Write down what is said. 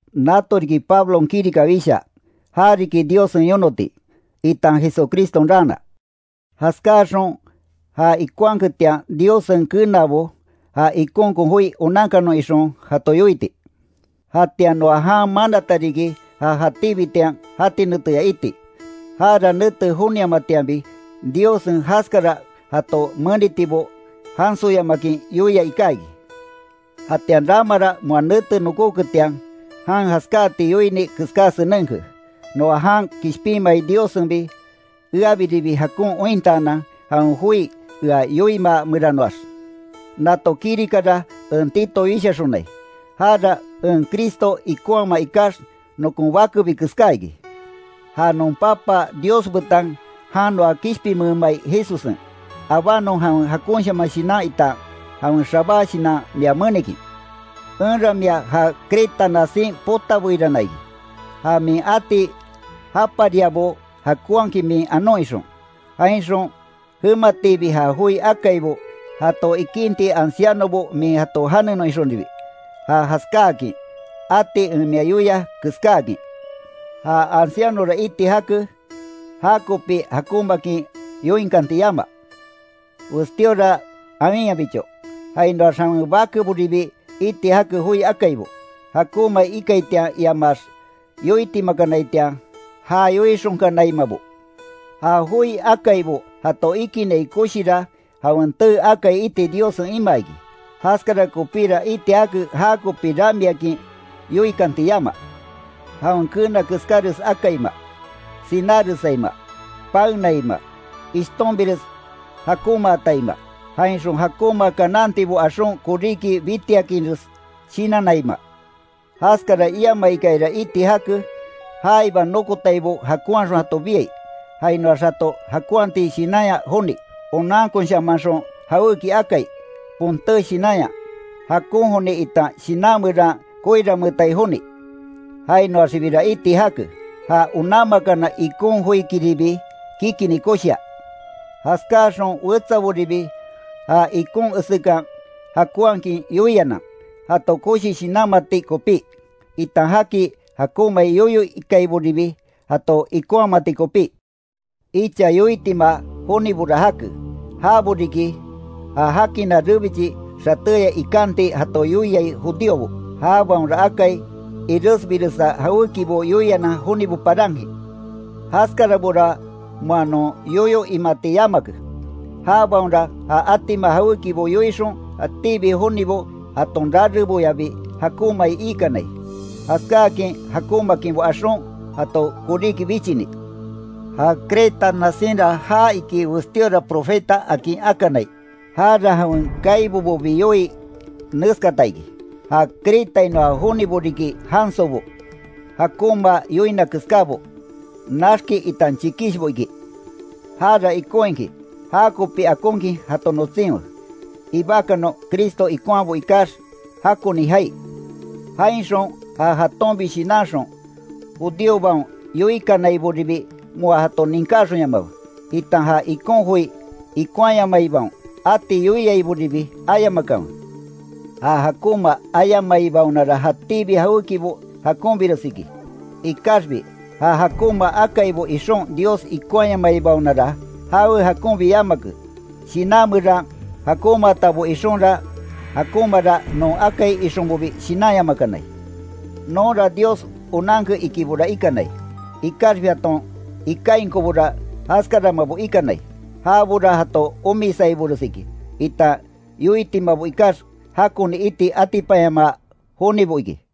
Nato riki Pablon kirika wishaa, ja riki Diossen yonoti, itan Jesucriston raana; jaskáxon ja ikonhaketian Diossen kenaabaon, ja ikonkon joi onankanon ixon jato yoiti. Jatian noa jan manata riki ja jatíbitian jati neteya iti. Jara nete joniamatianbi, Diossen jaskara jato menitibo, jansoyamakin yoia iká iki. Jatian ramara moa nete nokóketian jan jaskáati yoini keská senenke, noa jan kishpinmai Diossenbi eabiribi jakon ointaanan jawen joi ea yoimaa meranoax. Nato kirikara en Tito wishaxonai, jara en Cristo ikonhama ikax nokon bakebi keská iki. Ja non Papa Dios betan jan noa kishpinmeemai Jesussen, abanon jawen jakonshaman shinan itan jawen xabá shinan mia menikin. Enra mia ja Creta nasin potabeirana iki, ja min ati japariabo jakonhakin min anon ixon, jainxon jematiibi ja joi akaibo jato ikinti ancianobo min jato janenon ixonribi, ja jaskáakin ati en mia yoia keskáakin. Ja ancianora iti jake, jakopi jakonmaakin yoinkanti yama, westíora awinyabicho, jainoax jawen bakeboribi iti jake joi akaibo, jakonmai ikaitian iamaax yoitimakanaitian ja yoixonkanaimabo. Ja joi akaibo jato ikinai koshira jawen tee akai iti Diossen imaa iki. Jaskara kopíra iti jake jakopi ramiakin yoikanti yama; jawen keena keskáres akaima, sináresaima, paenaima, ishtonbires jakonmaataima, jainxon jakonma kanantibo axon koríki bitiakinres shinannaima. Jaskara iamaikayara iti jake; jaiba nokotaibo jakonhaxon jato biai, jainoax jato jakonhati shinanya joni; onankonshamanxon jawéki akai, ponté shinanya, jakon joni itan shinan meran koiranmeetai joni. Jainoaxibira iti jake, ja onanmakana ikon joikiribi kikini koshia. Jaskáaxon wetsaboribi ja ikon esekan jakonhakin yoianan, jato koshi shinanmati kopí, itan jaki jakonmai yoyo ikaiboribi, jato ikonhamati kopí. Icha yoitima jonibora jake, jabo riki, ja jakina rebichi xatéya ikanti jato yoiai judíobo. Jabaonra akai iresbiresa jawékibo yoianan jonibo parankin. Jaskarabora moa non yoyo imati yamake. Jabaonra ja atima jawékibo yoixon jatíbi jonibo jaton rareboyabi jakonmai iikanai. Jaskáakin jakonmaakinbo axon jato koríki bichini. Ja Creta nasinra jaa iki westíora profeta akin akanai; jara jawen kaibobobi yoii neskata iki: “Ja Cretainoa jonibo riki jansobo, jakonma yoina keskábo, naxki itan chikishbo”, iki. Jara ikon iki jakopi akonkin jato notsinwe, ibakanon Cristo ikonhabo ikax jakoni jaai. Jainxon ja jatonbi shinanxon, judíobaon yoikanaiboribi moa jato ninkáxonyamakanwe, itan ja ikon joi ikonhayamaibaon ati yoiaiboribi ayamakanwe. Ja jakonma ayamaibaonara jatíbi jawékibo jakonbires iki, ikaxbi ja jakonma akaibo ixon Dios ikonhayamaibaonara, jawe jakonbi yamake, shinan meran jakonmaatabo ixonra jakonmara non akai ixonbobi shinanyamakanai. Nonra Dios onanke ikibora ikanai, ikaxbi jaton ikainkobora jaskaramabo ikanai. Jabora jato omisaibores iki, itan yoitimabo ikax jakoni iti atipanyamaa jonibo iki.